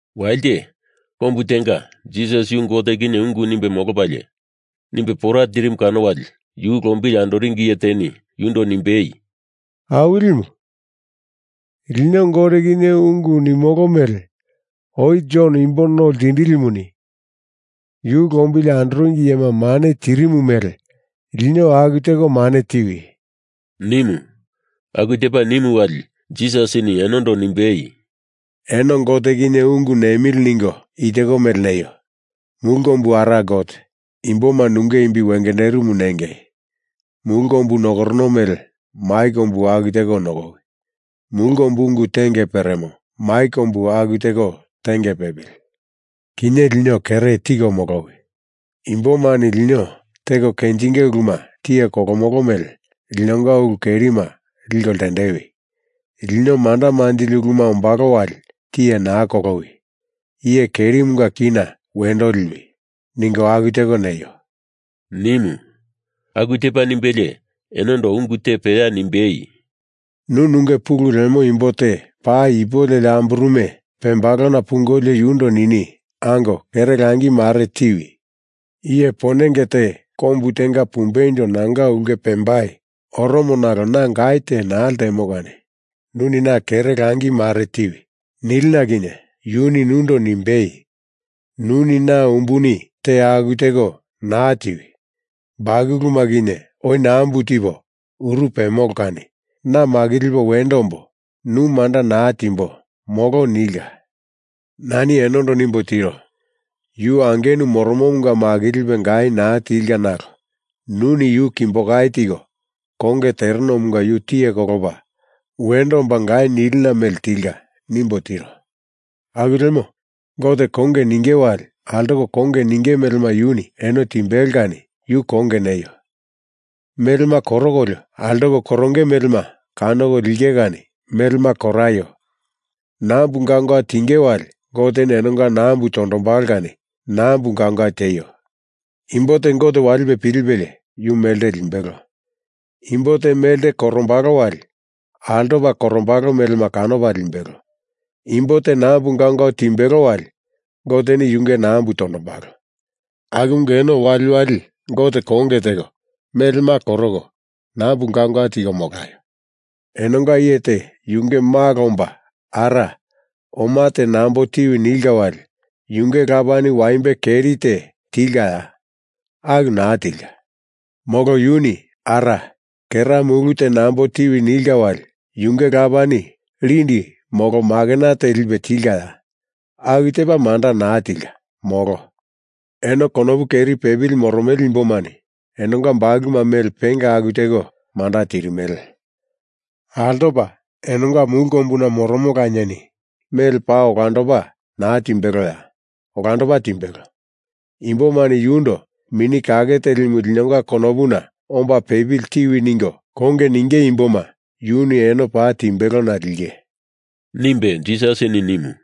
Walite, kombu tenga, Jisas yu Gote kinye ungu nimbe molopalie nimbe pora tirimu kano wali yu lombili andoringi iye teni yundo nimbei, “Awilimu, lino Gote kinye ungu nimolo mele oi Jon Imbo No Ltindilimuni yu lombili andoringi iyema mane tirimu mele lino aku teko mane tiwi!” nimu. Aku tepa nimu wali Jisasini enondo nimbei, “Eno Gote kinye ungu nemili ningo i teko mele neio: Mulu Kombu Ara Gote, Imboma nunge imbi wengenderimu nengei. Mulu kombu nokorono mele mai kombu aku teko nokowi. Mulu kombu ungu tenge peremo mai kombu aku teko tenge pepili. Kinye lino kere tiko molowi. Imbomani lino teko kenjinge uluma tiye kolomolo mele linonga ulu kerima liko ltendewi. Lino manda manjili uluma ombalo wali tiye naa kolowi. Iye kerimunga kina wendo liwi, ningo aku teko neio!” nimu. Aku tepa nimbelie enondo ungu te peya nimbei, “Nu nunge pulu lemo imbo te paa ipu leli amburume pembalona pungolio yundo nini, ‘Ango, kere langi mare tiwi! Iye ponenge te kombu tenga pumbeindo nanga ulke pembai oromo nalo na gai te naa ltemo kani nuni na kere langi mare tiwi,’ nilina kinye yuni nundo nimbei, ‘Nuni na umbuni te aku teko naa tiwi! Bakuluma kinye oi nambu tipo uru pemolo kani na makilipo wendo ombo, nu manda naa timbo, molo,’ nilka. Nani enondo nimbo tiro: Yu angenu moromomunga makilipe gai naa tilka nalo nuni yu kimbo kai tiko konge terenomunga yu tiye kolopa wendo omba gai nilina mele tilka nimbo tiro. Aku lemo, Gote konge ninge wali altoko konge ninge melema yuni eno timbelo kani yu konge neio! Melema korokolio altoko koronge melema kanoko linge kani melema koraio nambu gaungau tinge wali Goteni enonga nambu tondombalo kani nambu gaungau tieio! Imbo te Gote walipe pilipelie yu melte limbelo. Imbo te melte korombalo wali altopa korombalo melema kanopa limbelo. Imbo te nambu gaungau timbelo wali Goteni yunge nambu tondombalo. Akumunga eno waliwali Gote konge teko, melema koroko, nambu gaungau tiko molaio! Enonga iye te yunge malo omba ara, oma te nambo tiwi nilka wali yunge lapani waimbe keri te tilkaya? Aku naa tilka. Molo yuni ara, kera mulu te nambo tiwi nilka wali yunge lapani lindi molo makena te lipe tilkaya? Aku tepa manda naa tilka, molo. Eno konopu keri pepili moromele imbomani enonga bakuluma mele penga aku teko manda tirimele. Altopa enonga Mulu Kombuna Moromo Lanieni mele paa olandopa naa timbeloya? Olandopa timbelo. Imbomani yundo Mini Kake Telimu linonga konopuna omba pepili tiwi ningo konge ninge imboma yuni eno paa timbelona linge,” nimbe Jisasini nimu.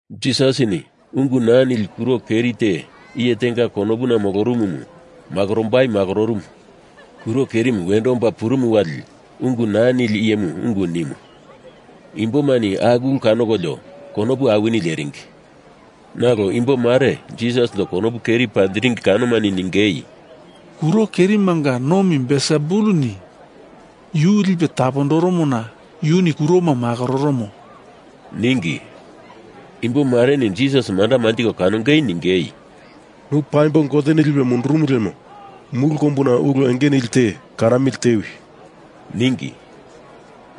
Jisasini ungu naa nili kuro keri te iye tenga konopuna molorumumu makorombai makororumu. Kuro kerimu wendo omba purumu wali ungu naa nili iyemuni ungu nimu. Imbomani aku ulumu kanokolio konopu awini leringi. Nalo imbo mare Jisasindo konopu keri panjiringi kanomani ningei, “Kuro kerimanga nomi Belsebulini yu lipe tapondoromona yuni kuroma makororomo,” ningi. Imbo mareni Jisas manda manjiko kanongei ningei, “Nu paimbo Goteni lipe mundurumu lemo mulu kombuna ulu enge nili te kanamili tewi,” ningi.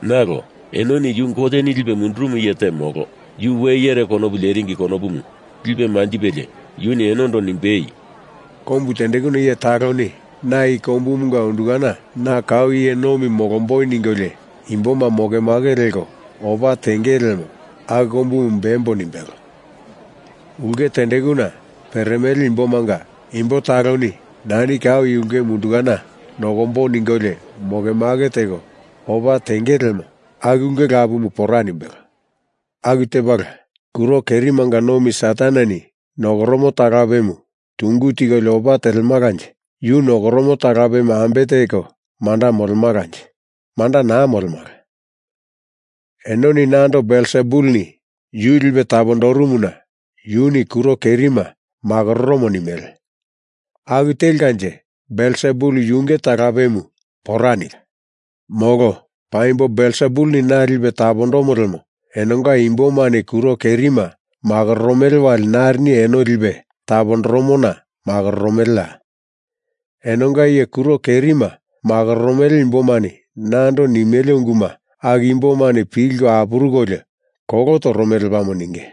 Nalo enoni yu Goteni lipe mundurumu iye te molo, yu we iyere konopu leringi konopu lipe manjipelie yuni enondo nimbei, “Kombu tendekuna iye taloni na i kombumunga undukana na kau iye nomi molomboi ningolio imboma mokemake leko opa tengele lemo aku kombumu bembo nimbelo. Ulke tendekuna peremele imbomanga imbo taloni nani kau i ulkemu undukana nokombo ningolio moke make teko opa tenge lemo aku ulke lapumu pora nimbelo. Aku tepala, kuro kerimanga nomi Sataneni nokoromo talapemu tungu tikolio opa telemalanje yu nokoromo talapemu ambe teko manda molemalanje? Manda naa molemala. Enoni nando Belsebulini yu lipe tapondorumona yuni kuro kerima makororomo nimele. Aku telkanje Belsebul yunge talapemu pora nilka. Molo paimbo Belsebulini na lipe tapondomo lemo enonga imbomani kuro kerima makororomele wali narini eno lipe tapondoromona makororomeleya? Enonga iye kuro kerima makororomele imbomani nando nimele unguma aku imbomani pilko apurukolio kolo toromele lepamo ninge.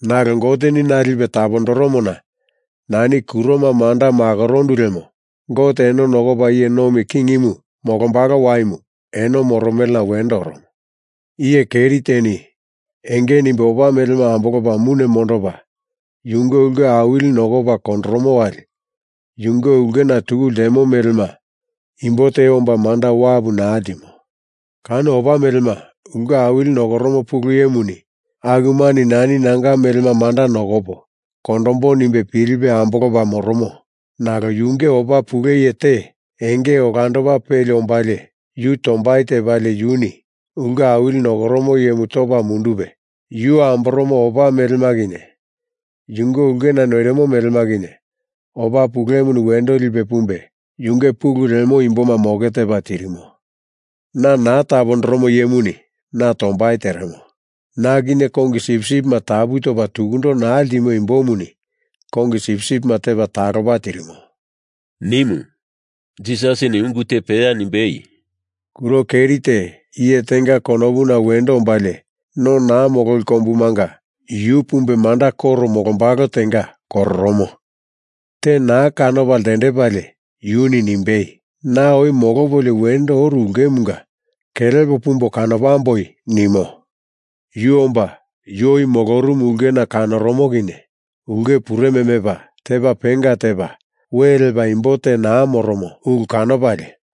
Nalo Goteni na lipe tapondoromona nani kuroma manda makorondu lemo Gote eno nokopa iye nomi kingimu molombalo waimu eno moromelena wendo oromo. Iye keri teni enge nimbe opa melema ambolopa mune mondopa yunge ulke awili nokopa kondoromo wali yunge ulkena tuku ltemo melema imbo te omba manda wapu naa ltimo. Kano opa melema ulke awili nokoromo pulu iyemuni akumani nani nanga melema manda nokopo kondombo nimbe pilipe ambolopa moromo, nalo yunge opa pule iye te enge olandopa peli ombalie yu tombai tepalie yuni ulke awili nokoromo iyemu topa mundupe yu amboromo opa melema kinye yunge ulkena noirimo melema kinye opa pulemuni wendo lipe pumbe yunge pulu lemo imboma moke tepa tirimo. Na naa tapondoromo iyemuni na tombai teremo. Na kinye kongi sipsipima tapu topa tukundo naa ltimo imbomuni kongi sipsipima tepa talopa tirimo,” nimu. Jisasini ungu te peya nimbei, “Kuro keri te iye tenga konopuna wendo ombalie, no naa mololi kombumanga yu pumbe manda koro molombalo tenga kororomo. Te naa kanopa ltendepalie yuni nimbei, ‘Na oi molopolio wendo oru ulkemunga kelepo pumbo kanopamboi,’ nimo. Yu omba yu oi molorumu ulkena kanoromo kinye, ulke pureme mepa tepa penga tepa we lepa imbo te naa moromo ulu kanopalie,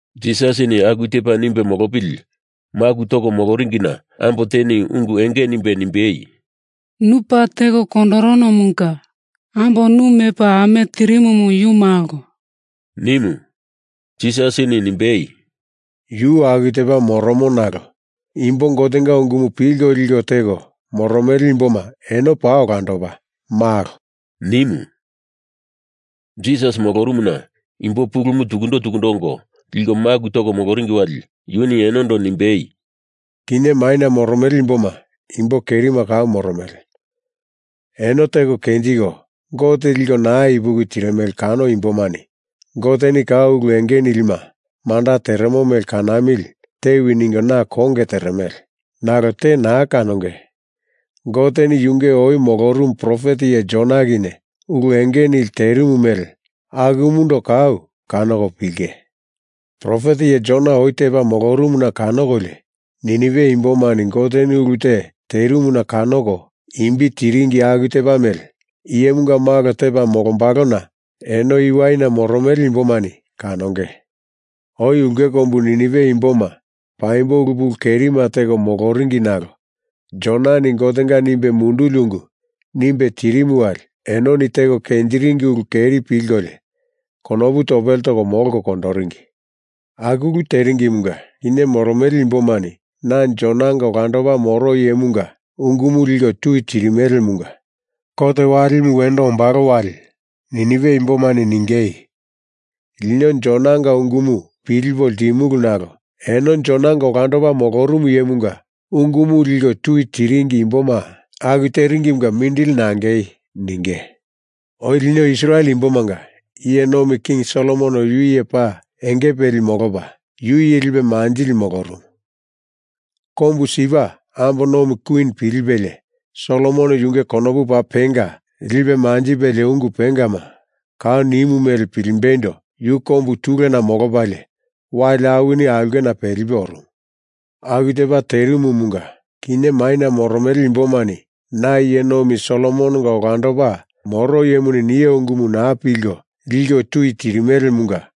Jisasini aku tepa nimbe molopili maku toko moloringina ambo teni ungu enge nimbe nimbei, “Nu paa teko kondoronomunga ambo nu mepa ame tirimumu yu malo,” nimu. Jisasini nimbei, “Yu aku tepa moromo nalo imbo Gotenga ungumu pilko liko teko moromele imboma eno paa olandopa malo,” nimu. Jisas molorumuna imbo pulumu tukundo tukundo ongo liko maku toringi wali yuni enondo nimbei, “Kinye maina moromele imboma imbo kerima kau moromele. Eno teko kenjiko Gote liko naa ipuki tirimele kano imbomani Goteni kau ulu enge nilima manda teremo mele kanamili tewi ningo na konge teremele. Nalo te naa kanonge. Goteni yunge oi molorumu profet iye Jona kinye ulu enge nili terimu mele akumundo kau kanoko pilinge. Profet iye Jona oi tepa molorumuna kanokolio Ninive imbomani Goteni ulu te terimuna kanoko imbi tiringi aku tepa mele Iyemunga Malo tepa molombalona eno i waina moromele imbomani kanonge. Oi ulke kombu Ninive imboma paimbo ulu pulu kerima teko moloringi nalo Jonani Gotenga nimbe munduli ungu nimbe tirimu wali enoni teko kenjiringi ulu keri pilkolio konopu topele toko molko kondoringi. Aku ulu teringimunga kinye moromele imbomani na Jonanga olandopa moro iyemunga ungumu liko tui tirimelemunga kot walimu wendo ombalo wali Ninive imbomani ningei, ‘Lino Jonanga ungumu pilipo ltimulu nalo eno Jonanga olandopa molorumu iyemunga ungumu liko tui tiringi imboma aku teringimunga mindili nangei,’ ninge. Oi lino Israel imbomanga iye nomi King Solomon yu iye paa enge peli molopa, yu iye lipe manjili molorumu. Kombu Sipa ambo nomi Kwin pilipelie, Solomon yunge konopu paa penga lipe manjipelie ungu pengama kau nimu mele pilimbeindo yu kombu tulena molopalie, wali awini aulkena pelipe orumu. Aku tepa terimumunga, kinye maina moromele imbomani na iye nomi Solomononga olandopa moro iyemuni nio ungumu naa pilko, liko tui tirimelemunga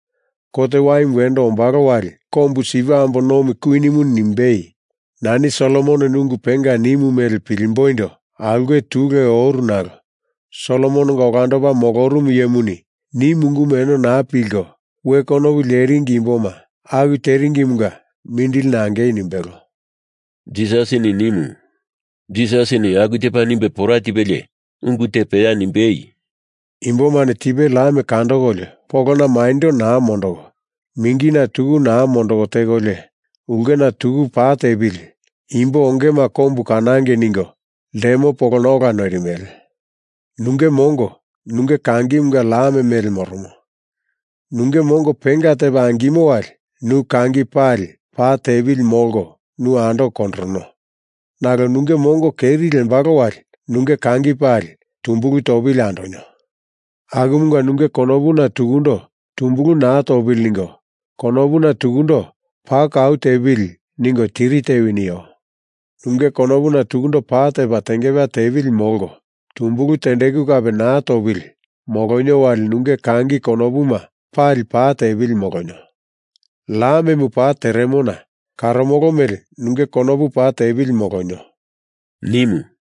kot waimu wendo ombalo wali kombu Sipa ambo nomi Kwinini nimbei, ‘Nani Solomononi ungu penga nimu mele pilimboindo aulke tule oru nalo Solomononga olandopa molorumu iyemuni nimu ungumu eno naa pilko, we konopu leringi imboma aku teringimunga mindili nangei,’ nimbelo,” Jisasini nimu. Jisasini aku tepa nimbe pora tipelie ungu te peya nimbei, “Imbomani tipe lam kandokolio polona maindo naa mondoko, mingina tuku naa mondoko tekolio, ulkena tuku pa tepili, imbo ongema kombu kanangei ningo ltemo polona ola noirimele. Nunge mongo nunge kangimunga lam mele moromo. Nunge mongo penga tepa angimo wali nu kangi pali pa tepili molko nu andoko kondorono. Nalo nunge mongo keri lembalo wali nunge kangi pali tumbulu topili andonio. Akumunga nunge konopuna tukundo tumbulu naa topili ningo konopuna tukundo pa kau tepili ningo tiri tewi nio. Nunge konopuna tukundo pa tepa tengepeya tepili molko tumbulu tendeku kape naa topili molonio wali nunge kangi konopuma pali pa tepili molonio. Lamemu pa teremona karomolo mele nunge konopu pa tepili molonio,” nimu.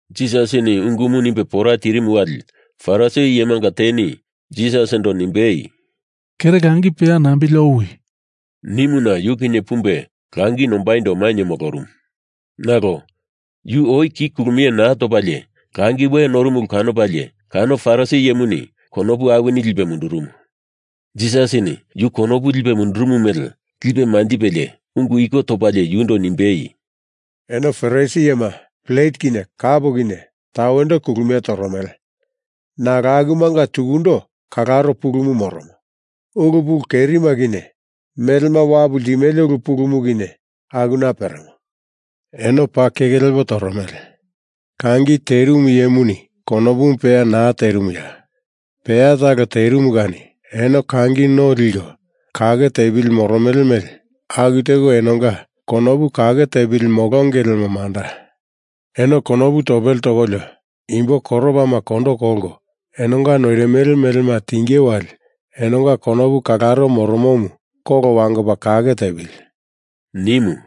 Jisasini ungumu nimbe pora tirimu wali Farisi iyemanga teni Jisasindo nimbei, “Kere langi peya nambili owi,” nimuna yu kinye pumbe langi nombaindo mainye molorumu. Nalo yu oi ki kulumie naa topalie langi we norumu ulu kanopalie kano Farisi iyemuni konopu awini lipe mundurumu. Jisasini yu konopu lipe mundurumu mele lipe manjipelie ungu iko topalie yundo nimbei, “Eno Farisi iyema plet kinye kap kinye tawendo kulumie toromele nalo akumunga tukundo kalaro pulumu moromo. Ulu pulu kerima kinye, melema wapu ltimele ulu pulumu kinye akuna peremo. Eno paa keke lepo toromele. Kangi terimu iyemuni konopumu peya naa terimuya? Peya talo terimu kani eno kangi no leko kake tepili moromele mele aku teko enonga konopu kake tepili molonge lemo manda. Eno konopu topele tokolio imbo koropama kondo kolko enonga noirimele melema tinge wali enonga konopu kalaro moromomu kolo wangopa kake tepili,” nimu.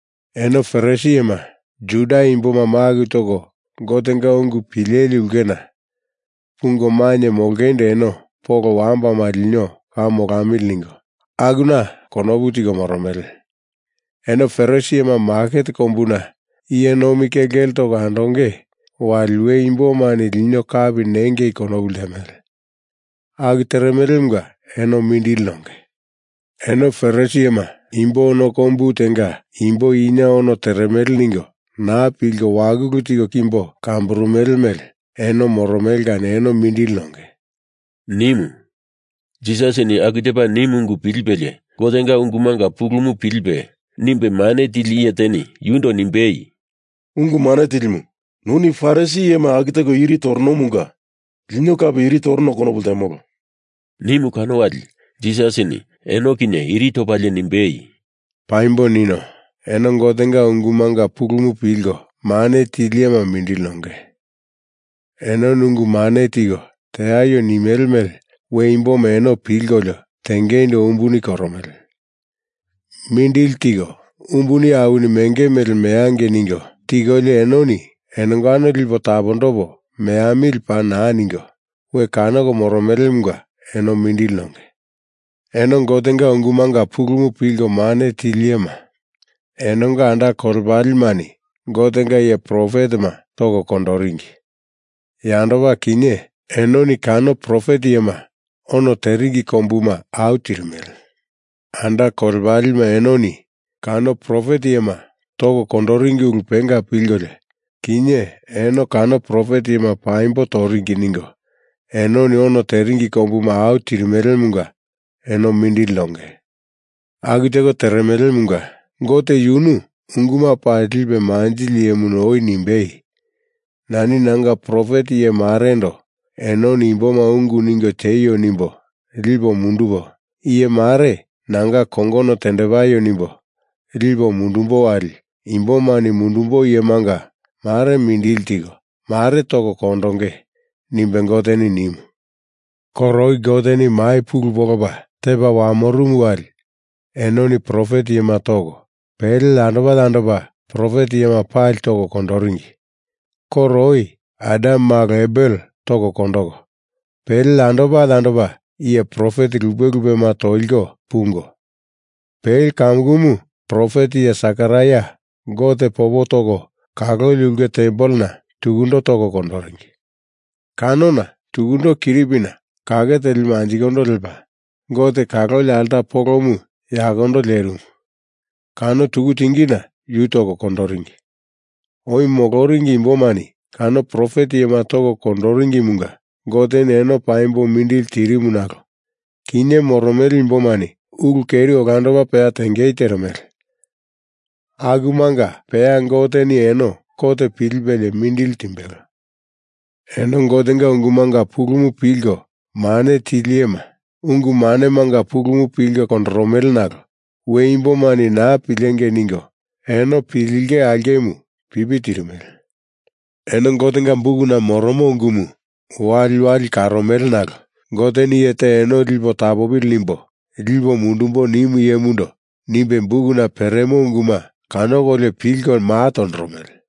Eno Farisi iyema, Juda Imboma maku toko Gotenga ungu pileli ulkena pungo mainye molongeindo eno polo wambana lino kau molamili ningo akuna konopu tiko moromele. Eno Farisi iyema maket kombuna iye nomi kelkele toko andonge wali we imbomani lino kapi nengei konopu ltemele. Aku teremelemunga eno mindili nonge. Eno Farisi iyema imbo ono kombu tenga imbo ina ono teremele ningo naa pilko wakulu tiko kimbo kamburumele mele eno moromele kani eno mindili nonge,” nimu. Jisasini aku tepa nimu ungu pilipelie Gotenga ungumanga pulumu pilipe nimbe mane tili iye teni yundo nimbei, “Ungu Mane Tilimu, nuni Farisi iyema aku teko iri toronomunga lino kape iri torono konopu ltemolo,” nimu kano wali Jisasini eno kinye iri topalie nimbei, “Paimbo nino. Eno Gotenga ungumanga pulumu pilko mane tili iyema mindili nonge. Enoni ungu mane tiko teaio nimele mele we imboma eno pilkolio tengeindo umbuni koromele. Mindili teko umbuni awini menge mele meangei ningo tikolio enoni enongano lipo tapondopo meamili paa naa ningo we kanoko moromelemunga eno mindili nonge. Eno Gotenga ungumanga pulumu pilko mane tili iyema, enonga anda kolepalemani Gotenga iye profetema toko kondoringi. Yandopa, kinye, enoni kano profet iyema ono teringi kombuma au tirimele. Anda kolepalema enoni kano profet iyema toko kondoringi ulu penga pilkolio, kinye eno kano profet iyema paimbo toringi. ningo enoni ono teringi kombuma au tirimelemunga eno mindili nonge. Aku teko teremelemunga, Gote yunu ungu pali lipe manjili iyemuni oi nimbei, ‘Nani nanga profet iye marendo enoni imboma ungu ningo tieio nimbo lipo mundupo, iye mare nanga kongono tendepaio nimbo lipo mundumbo wali imbomani mundumbo iyemanga mare mindili tiko, mare toko kondonge,’ nimbe Goteni nimu. Koro oi Goteni mai pulu polopa tepa wamorumu wali enoni profet iyema toko, pele yandopa yandopa profet iyema pali toko kondoringi. Koro oi Adam malo Abel toko kondoko, pele yandopa yandopa iye profet lupe lupema toliko pungo, pele kamukumu profet iye Sekaraia Gote popo toko kaloli ulke tempelena tukundo toko kondoringi. Kanona tukundo kiripina kake telimu anjikondo lepa, Gote kaloli alta polomu yakondo lerimu, kano tuku tingina yu toko kondoringi. Oi moloringi imbomani kano profet iyema toko kondoringimunga Goteni eno paimbo mindili tirimu nalo kinye moromele imbomani ulu keri olandopa peya tengei teremele, akumanga peya Goteni eno kot pilipelie mindili timbelo. Eno Gotenga ungumanga pulumu pilko mane tili iyema ungu manemanga pulumu pilko kondoromele nalo we imbomani naa pilengei ningo eno pilinge aulkemu pipi tirimele. Eno Gotenga bukuna moromo ungumu waliwali karomele nalo Goteni iye te eno lipe tapopili nimbo lipo mundumbo nimu iyemundo nimbe bukuna peremo unguma kanokolio pilko maa tondoromele.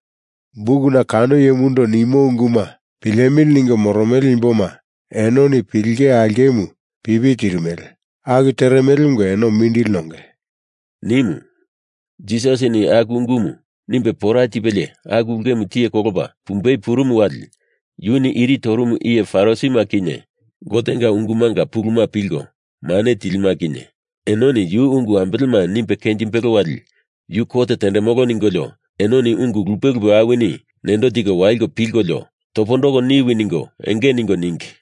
Bukuna kano iyemundo nimo unguma pilemili ningo moromele imboma enoni pilinge aulkemu pipi tirimele. Aku teremelemunga eno mindili nonge,” nimu. Jisasini aku ungumu nimbe pora tipelie aku ulkemu tiye kolopa pumbei purumu wali yuni iri torumu iye Farisima kinye Gotenga ungumanga pulumu pilko mane tilima kinye enoni yu ungu ambelema, nimbe kenjimbelo wali yu kot tendemolo ningolio enoni ungu lupe lupe awini nendo tiko waliko pilkolio topondoko niwi ningo enge ningo ningi.